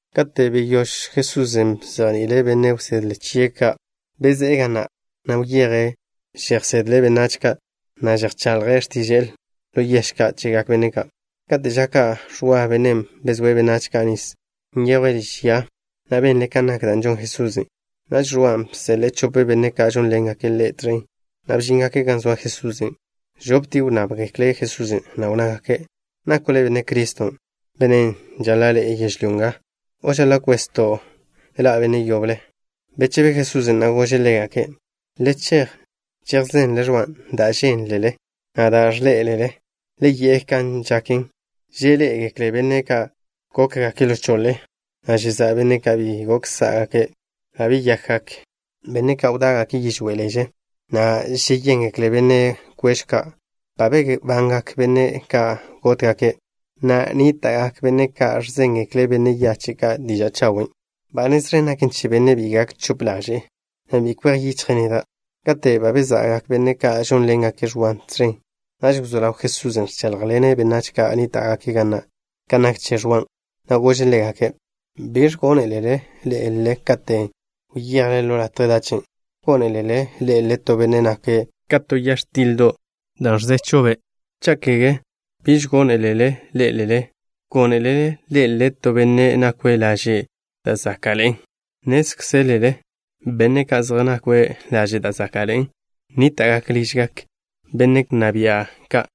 Kate' beyóž Jesusen' bzejni'ile' benne' wsedle chie' ka', bezé'e ga na', na' wyeje' žejsedle' benách ka', na' žejchaḻje' x̱tiže'e ḻo yež ka' chegak benne' ka'. Kate' ža ka' Ẕwa, bennen' bezóe' benách ka' nis, nyejwe' liž ya, na' benle' kan nak da' žon Jesusen'. Naž Ẕwan' bseḻe'e chope benne' ka' žónḻengake' ḻe' tẕen, na' bžíngake' gan zoa Jesusen'. Žoptie' wnnábgekle' Jesusen', na' wnnágake': —¿Nako' Le' Benne' Criston', Bennen' žaḻa' ḻe'e yežlyó nga, o žaḻa' kwezto' na' zejte ḻa' yetó benne'? Bechebe Jesusen', na' gože' ḻégake': —Le chej chejzenle Ẕwan' dan' žénlele, na' dan' ẕḻé'elele. Le yi'e kan žaken, žeḻé'egekle benne' ka' gókgake' ḻo choḻe, na' žeza'gak benne' ka' bi gok sá'gake'. Ba beyakgak chawe' benne' ka' wdá'gake' yižwé' leže, na' žeyéngekle benne' kweẕw ka'. Ba bebangak benne' ka' gótgake', na' nníta'gak benne' ka' ẕzéngekle' benne' yache' ka' diža' chawen'. Ba nez ẕen gaken che bennen' bi gak chope ḻaže'e, na' bi kwej yichje' neda'. Kate' ba beza'gak benne' ka' žónḻengake' Ẕwan' tẕen, naž wzó ḻaw Jesusen' ẕcháḻjḻene' benách ka' nníta'gake' ga na' kan nak che Ẕwan', na' gože' ḻégake': —¿Biẕ gónelele ḻé'elele katen' wyejle ḻo latje dachen'? ¿Gónelele ḻé'elele to benne' nake' ka to ya x̱tildo' da' ẕzechj be'? Cha' kege, ¿biẕ gónelele ḻé'elele? ¿Gónelele ḻé'elele to benne' nakwe' laže' da' záka'ḻe'en? Nnézkzelele benne' ka' zej nakwe' laže' da' záka'ḻe'en nníta'gake' ližgak benne' wnná bia' ka'.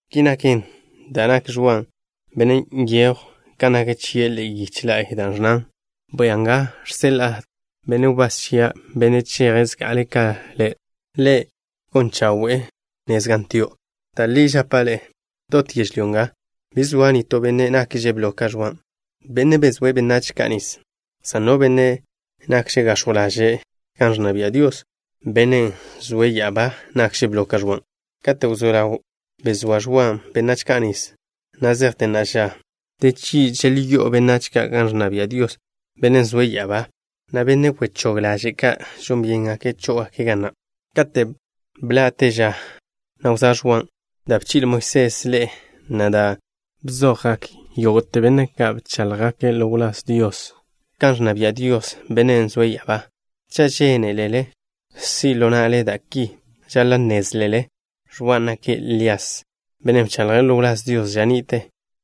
Ki naken dan' nak Ẕwan' bennen' nyejw kan nak chie' ḻe'e yiche la'y, da' ẕnnan: Bwia nga, žseḻa'a benne' wbás chia', bennen' cheje' zga'ale' ka Le'. Ḻe' gon chawe'e nez gan tio'. Da' li žapa' ḻe'e. Dot yežlyó nga, bi zoa nitó benne' nakže' blo ka Ẕwan', bennen' bezóe' benách ka' nis, san no benne' nakže' gax̱jw ḻaže' gan ẕnna bia' Dios, Bennen' zoe' ya'abá, nakže' blo ka Ẕwan'. ’Katen' wzó ḻaw bezóa Ẕwan' benách ka' nis, na' zejte na'a ža, de chgi' želžó'o benách ka' gan ẕnna bia' Dios, Bennen' zoe' ya'abá, na' benne' wechóg ḻaže' ka' žon byéngake' chó'ogake' ga na'. Kate' bḻa'te ža na' wzóa Ẕwan', da' bchi'le Moisés ḻe'e, na' da' bzojgak yógo'te benne' ka' bcháḻjgake' ḻo wláz Dios bḻoé'egeklen kan ẕnna bia' Dios, Bennen' zoe' ya'abá. Cha' žénelele si' ḻo na'le da' ki, žaḻa' nnézlele Ẕwan' nake' Lías, bennen' bchaḻje' ḻo wláz Dios ža ni'te,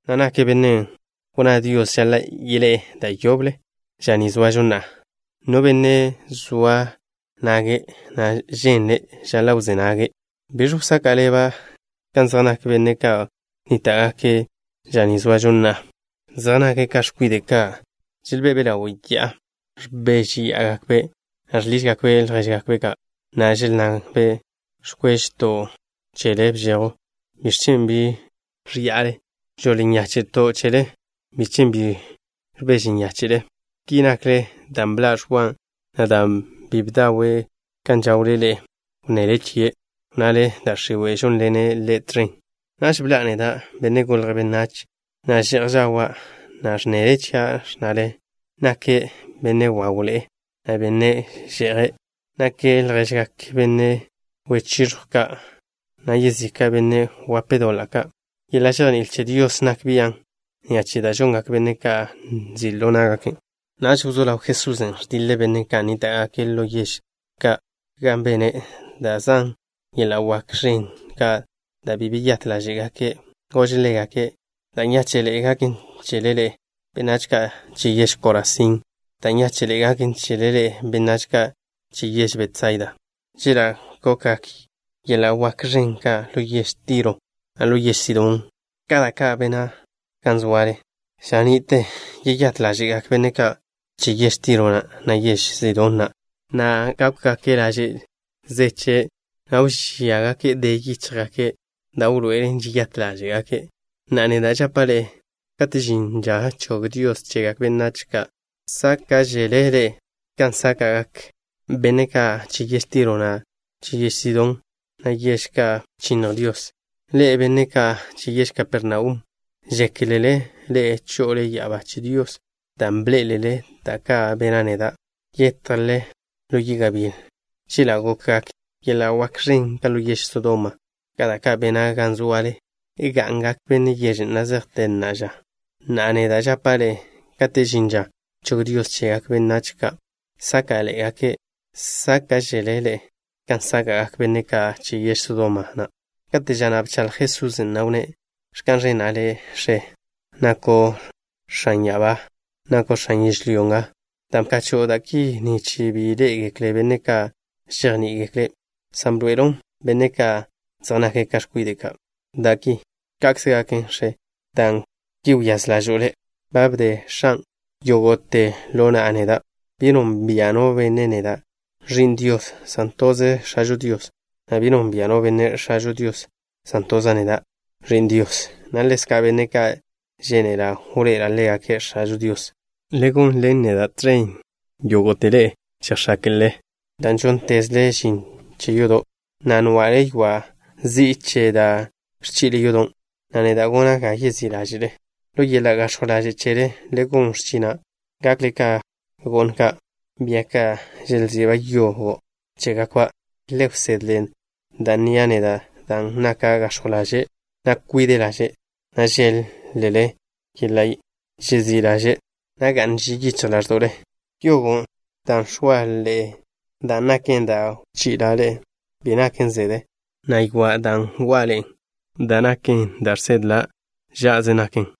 na' nake' bennen' wnná Dios žaḻa' yeḻé'e da' yoble ža ni zoažo na'a. No benne' zoa nage', na' ženle', žaḻa' wzé nage'. ’¿Biẕ wsaka' ḻeba' kan zej nak benne' ka' nníta'gake' ža ni zoažo na'a? Zej nake' ka x̱kwide' ka' želbe'be' ḻawe' ya'a. Ẕbéžeya'agakbe', na' žḻižgakbe' ljéžgakbe' ka', na' želnnabe': “Ẕkwéžeto' chele bžejw. ¿Biẕ chen' bi ẕa'ale? Žoḻ nyáche'to' chele. ¿Biẕ chen' bi ẕbeže nyáche'le?” Ki nakle, dan' bḻa' Ẕwan', na' dan' bi bdawe' kan žawle ḻe'e, wnnele chie', wnnale: “Da' x̱iwe' žónḻenen ḻe' tẕen.” Naž bḻa'a neda', Benne' Golje' Benách, na' že'j žawa', na' ẕnnele chia', ẕnnale: “Nake' benne' wawḻe'e, na' benne' že'je'. Nake' lježgak benne' wechiẕjw ka', na' yezika' benne' wen doḻa' ka'.” Yeḻa' žejní'il che Dios nak bian' ni'a che da' žongak benne' ka' nzi' ḻo ná'gaken'. Naž wzó ḻaw Jesusen' ẕdiḻe' benne' ka' nníta'gake' ḻo yež ka' gan bene' da' zan yeḻa' wak ẕen ka', dan' bi beyát ḻáže'gake'. Gože' ḻégake': —Da' nyáche'ḻe'e gaken chele ḻe'e, benách ka' che yež Korazín. Da' nyáche'ḻe'e gaken chele ḻe'e, benách ka' che yež Betsaida. Chela' gokgak yeḻa' wak ẕen ka' ḻo yež Tiro, na' ḻo yež Sidón ka da' ka' bena' gan zoale, ža ni'tel yeyát ḻáže'gak benne' ka' che yež Tiro na', na' che yež Sidón na', na' gákwgake' laže' zeche', na' wžíagake' de yíchjgake', da' wḻoe'elen žeyát ḻáže'gake'. Na'a, neda' žapa' ḻe'e, kate' žin ža chog Dios chegak benách ka' sáka'ḻe'egake', sáka'žele ḻe'e kan sáka'gak benne' ka' che yež Tiro na', na' che yež Sidón na', yež ka' bchinnj Dios. Ḻe'e, benne' ka' che yež Kapernaum, ¿žékelele ḻe'e cho'ole ya'abá che Dios dan' bḻé'elele da' ka' bena' neda'? Yetjle ḻo yi' gabíl. Chela' gokgak yeḻa' wak ẕen ka' ḻo yež Sodoma, ka da' ka' bena' gan zoale, ga'ngak benne' yežen', na' zejte na'a ža. Na'a, neda' žapa' ḻe'e, kate' žin ža chog Dios chegak benách ka' sáka'ḻe'egake', sáka'žele ḻe'e kan sáka'gak benne' ka' che yež Sodoma na'. Kate' ža na' bchaḻj Jesusen', na' wnné': —Ẕka'n ẕena' Le', X̱e, nako' X̱an ya'abá, na' X̱an yežlyó nga, dan' bkacho'o da' ki, nich bi ḻé'egeklen benne' ka' žejní'igekle', san bḻoe'elo' benne' ka' zej nake' ka x̱kwide' ka' da' ki. Ka'kze gaken, X̱e, dan' ki wyáz ḻažo'o Le'. Ba bde X̱an' yógo'te ḻo na'a neda'. Bi nonbia' no benne' neda', Ẕi'n Dios, san toze X̱ažo Dios, na' bi nonbia' no benne' X̱ažo Dios, san toza' neda', Ẕi'n Dios, na' ḻezka' benne' ka' žénela' wḻoe'ela' ḻégake' X̱ažo Dios. Le gonḻen neda' tẕen yógo'tele žejx̱áke'le dan' žóntezle žin che yodo', na' nwa'le ywa' zi'i che da' ẕchi'le yodo', na' neda' gona' ga yezí' ḻáže'le. Ḻo yeḻa' gax̱jw ḻaže' chele le gon x̱china', gakle ka go'n ka', bia ka' želzi'ba' yogo' chégakba'. Le wsedle da' nnia' neda', dan' naka' gax̱jw ḻaže', na' kwide' ḻaže', na' žéḻ-lele yeḻa' žezí' ḻaže', na' ga'n ži yichj ḻáẕdo'le. Yogon' dan' x̱oa' ḻe'e, dan' naken da' wchi'la' ḻe'e, bi naken zede, na' ywa' wa'a ḻe'e da' naken da' žsedla', žá'ado'ze naken.